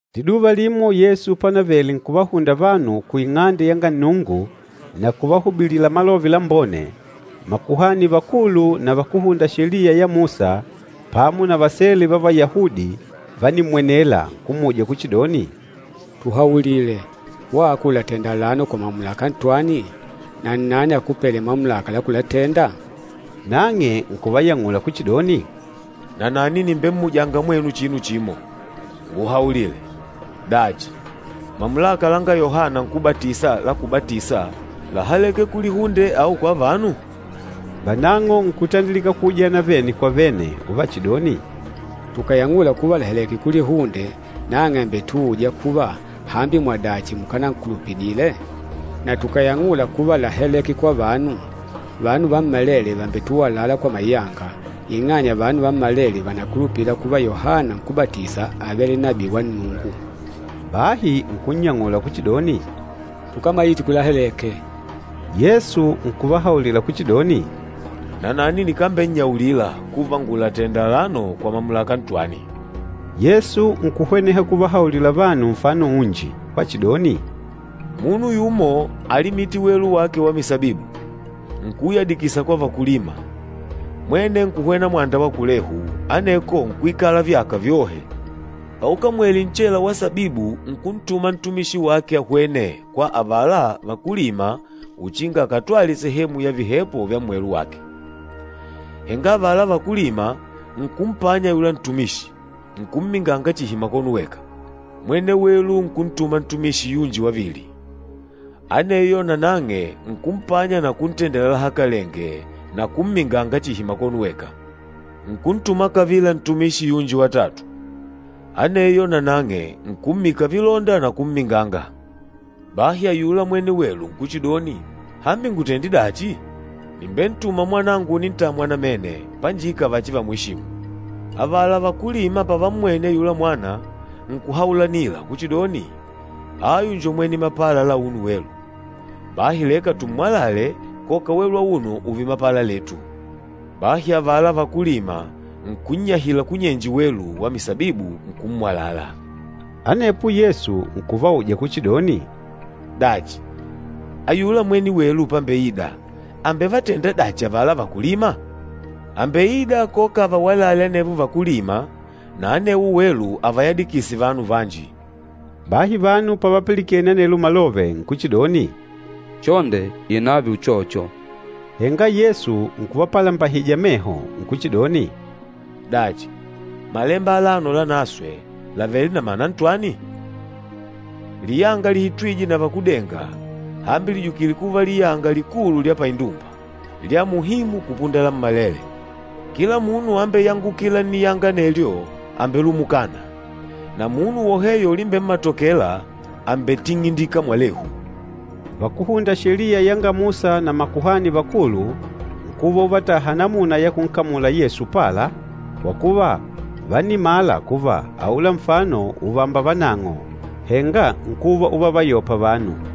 Liduva limo Yesu panavele nkuvahunda vanu ku Ing'ande yanga Nnungu na kuvahubilila Malove Lambone, makuhani vakulu na vakúhunda Sheliya ya Musa pamo na vasele va Vayahudi vánimmwenela, nkummuja kuchidoni, “Tuhaulile! Wako ùlatenda alano kwa mamulaka ntwani? Na nnani akupêle mamulaka la kulatenda?” Nang'e nkuvayang'ula kuchidoni, “Nanani nìmbemmujanga mwenu chinu chimo. Nguhaulile, dachi, mamulaka langa Yohana Nkúbatisa la kubatisa láhaleke kulihunde au kwa vanu?” Vanang'o nkutandilika kuujana vene kwa vene uvachidoni, “Tukàyang'ula kuva làhaleke kulihunde, nang'e àmbetuuja kuva, ‘Hambi mwadachi mukánankulupidile?’ Na tukàyang'ula kuva láhaleke kwa vanu, vanu vammalele vàmbetuwalala kwa mayanga, ing'anya vanu vammalele vànakulupila kuva Yohana Nkúbatisa ávele nabii wa Nnungu.” Bahi nkunnyang'ula kuchidoni, “Tukámaite kulahaleke.” Yesu nkuvahaulila kuchidoni, “Nanani nikambennyaulila kuva ngùlatenda alano kwa mamulaka ntwani.” Yesu nkuhweneha kuvahaulila vanu nfano unji wachidoni, “Munu yumo álimite welu wake wa misabibu, nkuuyadikisa kwa vakúlima, mwene nkuhwena mwanda wa kulehu, aneko nkuikala vyaka vyohe. Paukamwele nchela wa sabibu nkuntuma ntumishi wake ahwene kwa avala vakúlima uchinga akatwale sehemu ya vihepo vya mmwelu wake. Henga avala vakúlima nkumpanya ayula ntumishi, nkumminganga chihi makono weka. Mwene welu nkuntuma ntumishi yunji wavili, aneyo nanang'e nkumpanya na kuntendela lahakalenge na kumminganga chihi makono weka. Nkuntuma kavila ntumishi yunji watatu, aneyo nanang'e, nkummika vilonda na kumminganga. Bahi ayula mwene welu nkuchidoni, ‘Hambi ngutende dachi? Nìmbentuma mwanangu unintamwa namene, panjika vachivamweshimu.’ Avala vakúlima pavammwene ayula mwana, nkuhaulanila kuchidoni, ‘Ayu njo mwene mapala la auno welu. Bahi leka tummwalale koka welu auno ùùve mapala letu.’ Bahi avala vakúlima nkunnyahila kunyenje welu wa misabibu, nkummwalala.” Anepo Yesu nkuvauja kuchidoni, “Dachi, ayula mwene welu pambeida àmbevatenda dachi avala vakúlima? Àmbeida koka avawalale anevo vakúlima, na anewo welu avayadikise vanu vanji.” Bahi vanu pavapilikene anelo malove nkuchidoni, “Chonde inààve uchocho!” Henga Yesu nkuvapalambahija meho, nkuchidoni, “Dachi, Malemba alano Lanaswe làvele na mana ntwani? ‘Liyanga lihitwîje na vakúdenga, hambi lìjukile kuva liyanga likulu lya paindumba, lya muhimu kupunda lammalele!’ Kila munu ambeyangukîla nniyanga anelyo àmbelumukana, na munu woheyo ulimbemmatokela, àmbetingindika mwalehu.” Vakúhunda Sheliya yanga Musa na makuhani vakulu nkuva uvataha namuna ya kunkamula Yesu upala, kwa kuva, vánimala kuva aula nfano ùvamba vanang'o, henga nkuva uvavayopa vanu.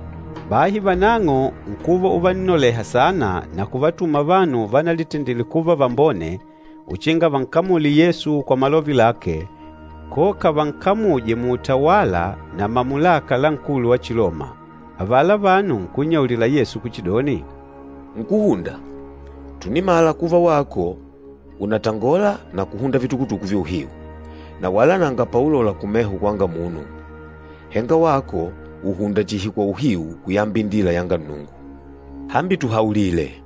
Bahi vanang'o nkuva uvannoleha saana na kuvatuma vanu vanalitendile kuva vambone uchinga vankamule Yesu kwa malove lake koka vankamuje muutawala na mamulaka la nkulu wa Chiloma. Avala vanu nkunnyaulila Yesu kuchidoni, “Nkúhunda, tùnimala kuva wako ùnatangola na kuhunda vitukutuku vya uhiu, na wala nanga paulola kumeho kwanga munu, henga wako ùhunda chihi kwa uhiu kuyamba indila yanga Nnungu. Hambi tuhaulile,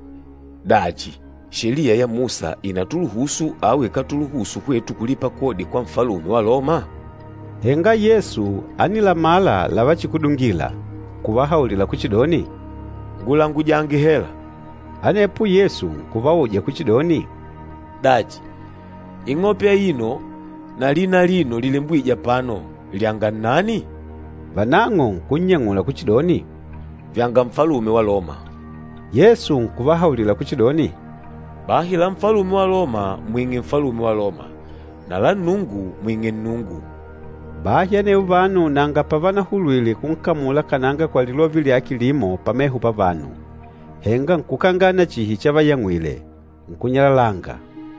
dachi Sheliya ya Musa ìnatuluhusu au ikátuluhusu hwetu kulipa kodi kwa Nfalume wa Loma?” Henga Yesu ánilamala lavachikudungila, nkuvahaulila kuchidoni, “Ngulangujange hela.” Anepo Yesu nkuvauja kuchidoni, “Dachi, ing'ope aino na lina alino lilembwîje apano lyanga nnani?” Vanang'o nkunnyang'ula kuchidoni, “Vyanga Nfalume wa Loma.” Yesu nkuvahaulila kuchidoni, “Bahi la Nfalume wa Loma mwing'e Nfalume wa Loma na la Nnungu mwing'e Nnungu.” Bahi anevo vanu nanga pavanahulwile kunkamula kananga kwa lilove lyake limo pameho pavanu, henga nkukangana chihi chavayang'wile, nkunyalalanga.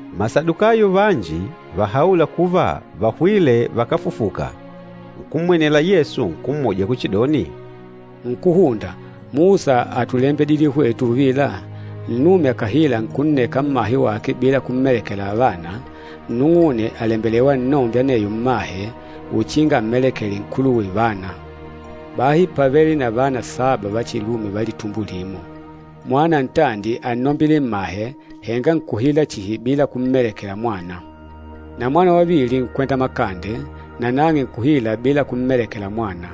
Masadukayo vanji vahaûla kuva vahwîle vakáfufuka, nkummwenela Yesu nkummuja kuchidoni, “Nkúhunda, Musa átulembidile hwetu uvila, ‘Nnume akàhila nkunneka mmahe wake bila kummelekela vana, nnung'une àlembelewa annombe aneyo mmahe, uchinga ammelekele nkuluwe vana.’ Bahi pávele na vana saba va chilume va litumbo limo. Mwana ntandi ánnombile mmahe, henga nkuhila chihi bila kummelekela mwana. Na mwana wavili nkwenda makande, nanang'e nkuhila bila kummelekela mwana,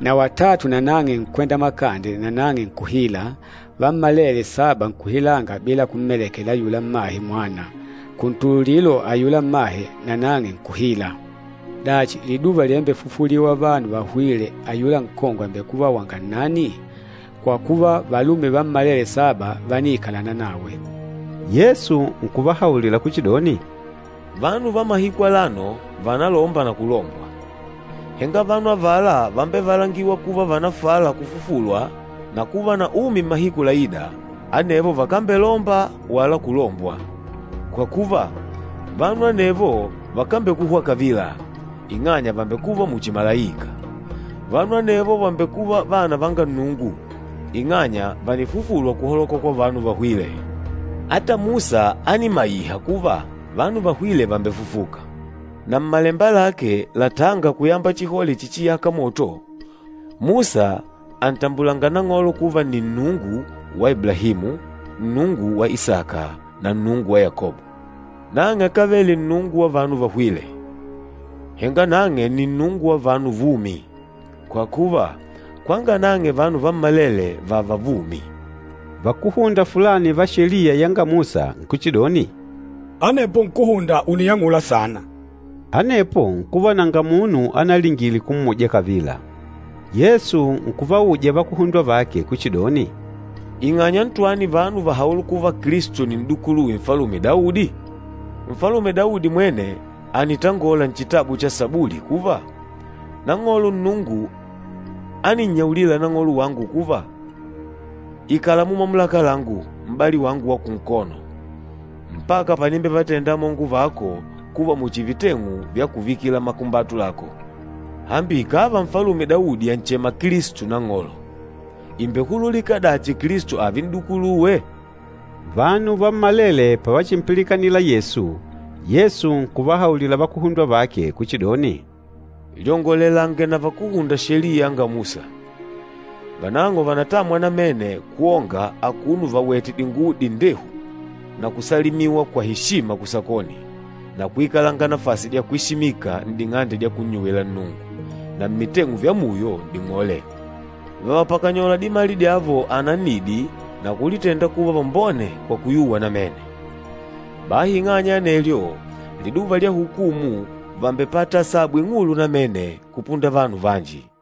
na watatu nanang'e nkwenda makande nanang'e nkuhila, vammalele saba nkuhilanga bila kummelekela ayula mmahe mwana. Kuntululilo ayula mmahe nanang'e nkuhila. Dachi, liduva livambefufuliwa vanu vahwîle ayula nkongwe àmbekuva wanga nnani? Kwa kuva, valume vammalele saba vániikalana nawe.” Yesu nkuvahaulila kuchidoni, “Vanu va mahiku alano vànalomba na kulombwa, henga vanu avala vambevalangîwa kuva vànafala kufufulwa na kuva na umi mmahiku laîda, anevo vakambelomba wala kulombwa. Kwa kuva, vanu anevo vakambekuhwa kavila, ing'anya vàmbekuva muchi malaika. Vanu anevo vàmbekuva vana vanga Nnungu, ing'anya vànifufulwa kuhaloka kwa vanu vahwîle. Ata Musa ánimaiha kuva vanu vahwîle vàmbefufuka. Na mmalemba lake latânga kuyamba chihole chichiyâka moto, Musa àntambulanga Nang'olo kuva nni, ‘Nnungu wa Iblahimu, Nnungu wa Isaka, na Nnungu wa Yakobo.’ Nang'e akávele Nnungu wa vanu vahwîle, henga nang'e ni Nnungu wa vanu vumi, kwa kuva, kwanga nang'e vanu vammalele vààva vumi.” Vakúhunda fulani va Sheliya yanga Musa nkuchidoni, “Anepo nkúhunda ùniyang'ula sana.” Anepo nkuva nanga munu analingile kummuja kavila. Yesu nkuvauja vakuhundwa vake kuchidoni, “Ing'anya ntwani vanu vàhaula kuva Kilisto nni n'dukuluwe Nfalume Daudi? Nfalume Daudi mwene ànitangola nchitabu cha Sabuli kuva, ‘Nang'olo Nnungu áninnyaulila Nang'olo wangu kuva, “Ikala mumamulaka langu, m'bali wangu wa kunkono, mpaka panimbevatenda amongo vako kuva muchi viteng'u vya kuvika makumbatu lako.” ’ Hambi ikàva Nfalume Daudi ànchema Kilisto ‘Nang'olo,’ ìmbehululika dachi Kilisto ààve n'dukuluwe?” Vanu vammalele pavachimpilikanila Yesu, Yesu nkuvahaulila vakuhundwa vake kuchidoni, “Lyongolelange na vakúhunda Sheliya yanga Musa, vanang'o vànatamwa namene kwonga akuno vawètè dinguwo dindehu na kusalimiwa kwa eshima kusakoni na kuikalanga nafasi dya kwesimika n'ding'ande dya kunnyuwila Nnungu na mmiteng'u vya muyo n'ding'ole. Vàvapakanyola dimali dyavo anannidi na kulitenda kuva vambone kwa kuyuwa namene! Bahi ing'anya ya anelyo, liduva lya hukumu vàmbepata asabu ing'ulu namene kupunda vanu vanji!”